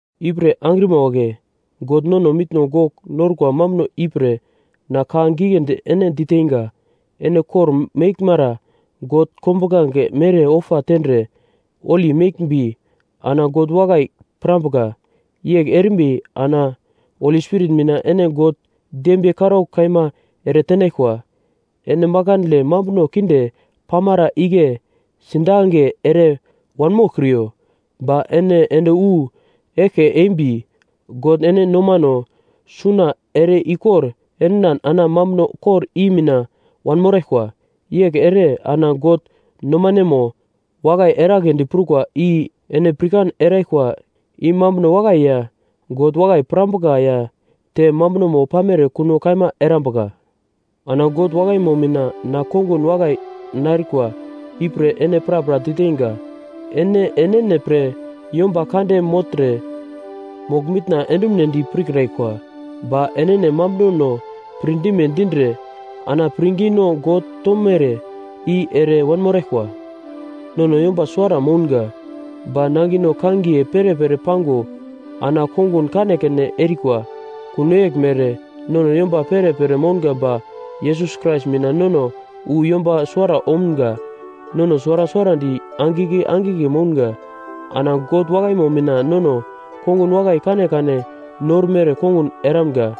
Ipre angrima wagle, God nono mitno gogl norkwa mambuno ipre na ka giglendi ene diteinga, ene kor-meglmere God kombuglange mere ofa tendre holi meglmbi ana God wakai pirambuka. Yegl erimbi ana Spirit mina ene God dembiye karaugl kaima eretenaglkwa. Ene makandle mambuno kinde pamara igle sidange ere wanmoglkriyo, ba ene ende wu eglke embi God ene nomano suna ere-ikor endinan ana mambuno kor i mina wanmoraglkwa. Yegl ere ana God nomanemo wakai eragledi prukwa i ene pirkan eraglkwa i mambuno wakai ya, God wakai pirambuka ya, te mambunomo pamere kuno kaima erambuka. Ana God wakaimo mina na kongun wakai narkwa ipre ene prapra diteinga: Ene enene pre yomba kande mogltre mogl-mitna endumunedi pirkraglkwa. Ba enene mambunono pirdime dindre ana pirngino God tomere i ere wanmoraglkwa. Nono yomba suwara mounga, ba nangino kangiye perepere pango ana kongun kanekane erikwa. Kuno yeglmere, nono yomba perepere mounga ba Yesus Krais mina nono wu yomba suwara omga. Nono suwara suwarandi angigle angigle mounga. Ana God wakaimo mina nono kongun wakai kanekane normere kongun eramga.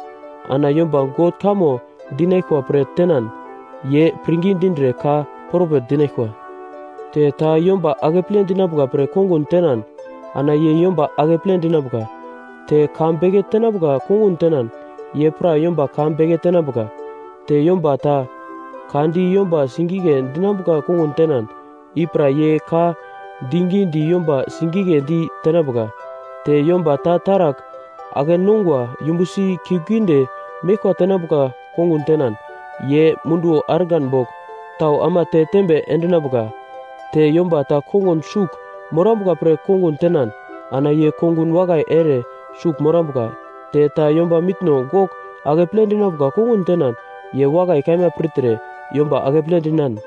Ana yomba God kamo dinaglkwa pre tenan, ye pirngi dindre ka propet dinaglkwa. Te ta yomba akeple dinambuka pre kongun tenan, ana ye yomba akeple dinambuka. Te ka beke tenambuka kongun tenan ye pra yomba ka beke tenambuka. Te yomba ta ka di yomba sigigle dinambuka kongun tenan, i pra ye ka digi di yomba sigigledi tenambuka. Te yomba ta taragl ake-nongwa yumbusi kiuglgiunde meglkwa tenambuka kongun tenan, ye munduwo argan bogl tau ama te tembe endinambuka. Te yomba ta kongun sugl morambuka pre kongun tenan ana ye kongun wakai ere sugl morambuka. Te ta yomba mitno gogl akeple dinambuka kongun tenan, ye wakai kaima pirtre yomba akeple dinan,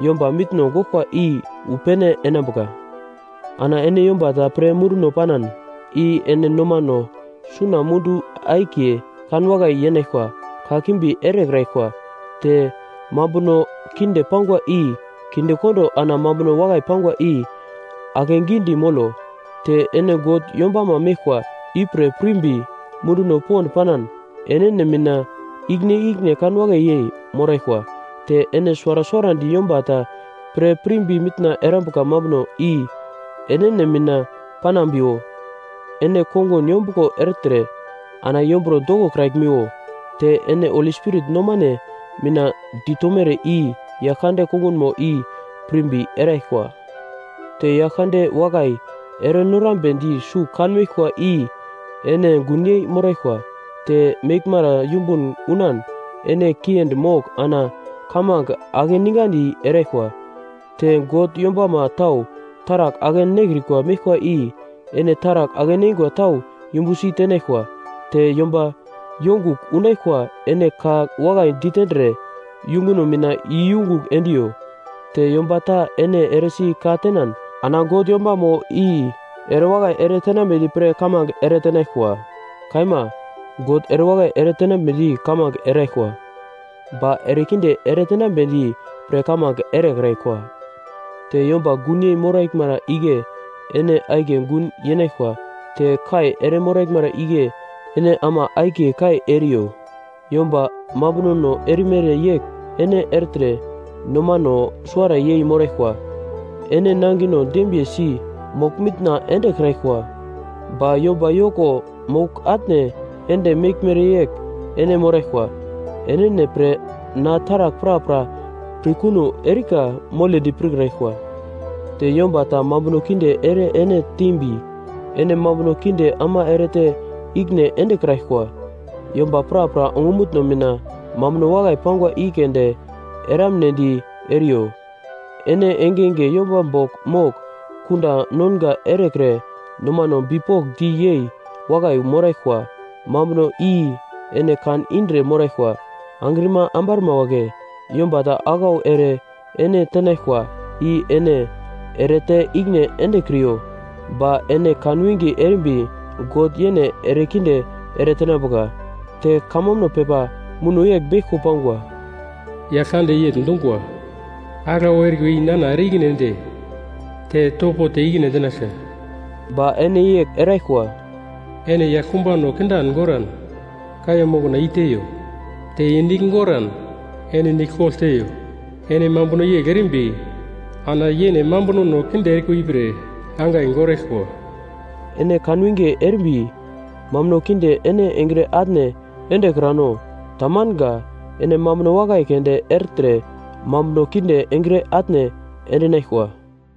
yomba mitno goglkwa i wu pene enambuka. Ana ene yomba ta pre munduno panan, i ene nomano suna mundu akiye kanwakai yenaglkwa kakimbi erekraglkwa. Te mambuno kinde pangwa i kindekondo ana mambuno wakai pangwa i akegidi molo. Te ene God yombamo meglkwa ipre pirimbi munduno pond panan enene mina ikine-ikine kanwakai yei moraglkwa. Te ene suwara suwarandi yomba ta pre pirimbi mitna erambuka mambuno i enene mina panambiwo. Ene kongun yombuglo ertre ana yomburo dokokraglmiwo. Te ene Holi Spirit nomane mina ditomere i Yaglkande kongunmo i pirimbi eraglkwa. Te Yaglkande wakai erenorambedi sugl kanmeglkwa i ene gunyei moraglkwa, te meglmara yumbun unan ene kiendi mogl ana kamange akeningandi eraglkwa. Te God yombama tau taragl ake-nekrikwa meglkwa i ene taragl ake-neingwa tau yumbusi tenaglkwa. Te yomba yongugl unaglkwa ene ka wakai ditendre yunguno mina iyungugl endiyo. Te yomba ta ene eresi ka tenan, ana God yombamo i erewakai eretenambedi pre kamange eretenaglkwa. Kaima, God erewakai eretenambedi kamange eraglkwa, ba erekinde eretenambedi pre kamange erekraglkwa. Te yomba gunyei moraglmara igle ene akiye gun yenaglkwa te kai ere moraglmara igle ene ama akiye kai eriyo. Yomba mambunono erimere yegl ene ertre nomano suwara yei moraglkwa. Ene nangino dembiyesi mogl-mitna endekraglkwa, ba yomba yoko mogl-atne ende meglmere yegl ene moraglkwa. Enene pre na taragl prapra pirkuno erika moledi pirkraglkwa. Te yomba ta mambuno kinde ere ene tembi, ene mambuno kinde ama erete ikine endekraglkwa. Yomba prapra ongumutno mina mambuno wakai pangwa i keunde eramnedi eriyo. Ene engenge yomba bogl mogl kunda nonga erekre nomano bipokndi yei wakai moraglkwa mambuno i ene kan indre moraglkwa. Angrima ambarma wagle, yomba ta aglau ere ene tenaglkwa, i ene erete ikine endekriyo, ba ene kan winge erimbi God yene erekinde eretenambuka. Te kamambuno pepa muno yegl beglko pangwa: “Yaglkande yegl dungwa, aglau erikwa i nana ere-ikine ende, te topo te ikine endinaglka.” Ba ene yegl eraglkwa: “Ene yaglkumbano kindan goran, kaiya mokna i-teiyo, te ye nigl goran, ene nigl kogl teiyo. Ene mambuno yegl erimbi ana yene mambunono kinde erikwa ipre angai goraglkwa.” Ene kanwinge erimbi mambuno kinde ene engre atne endekrano. Tamanga. Ene mambuno wakai keunde ertre mambuno kinde engre atne endinaglkwa.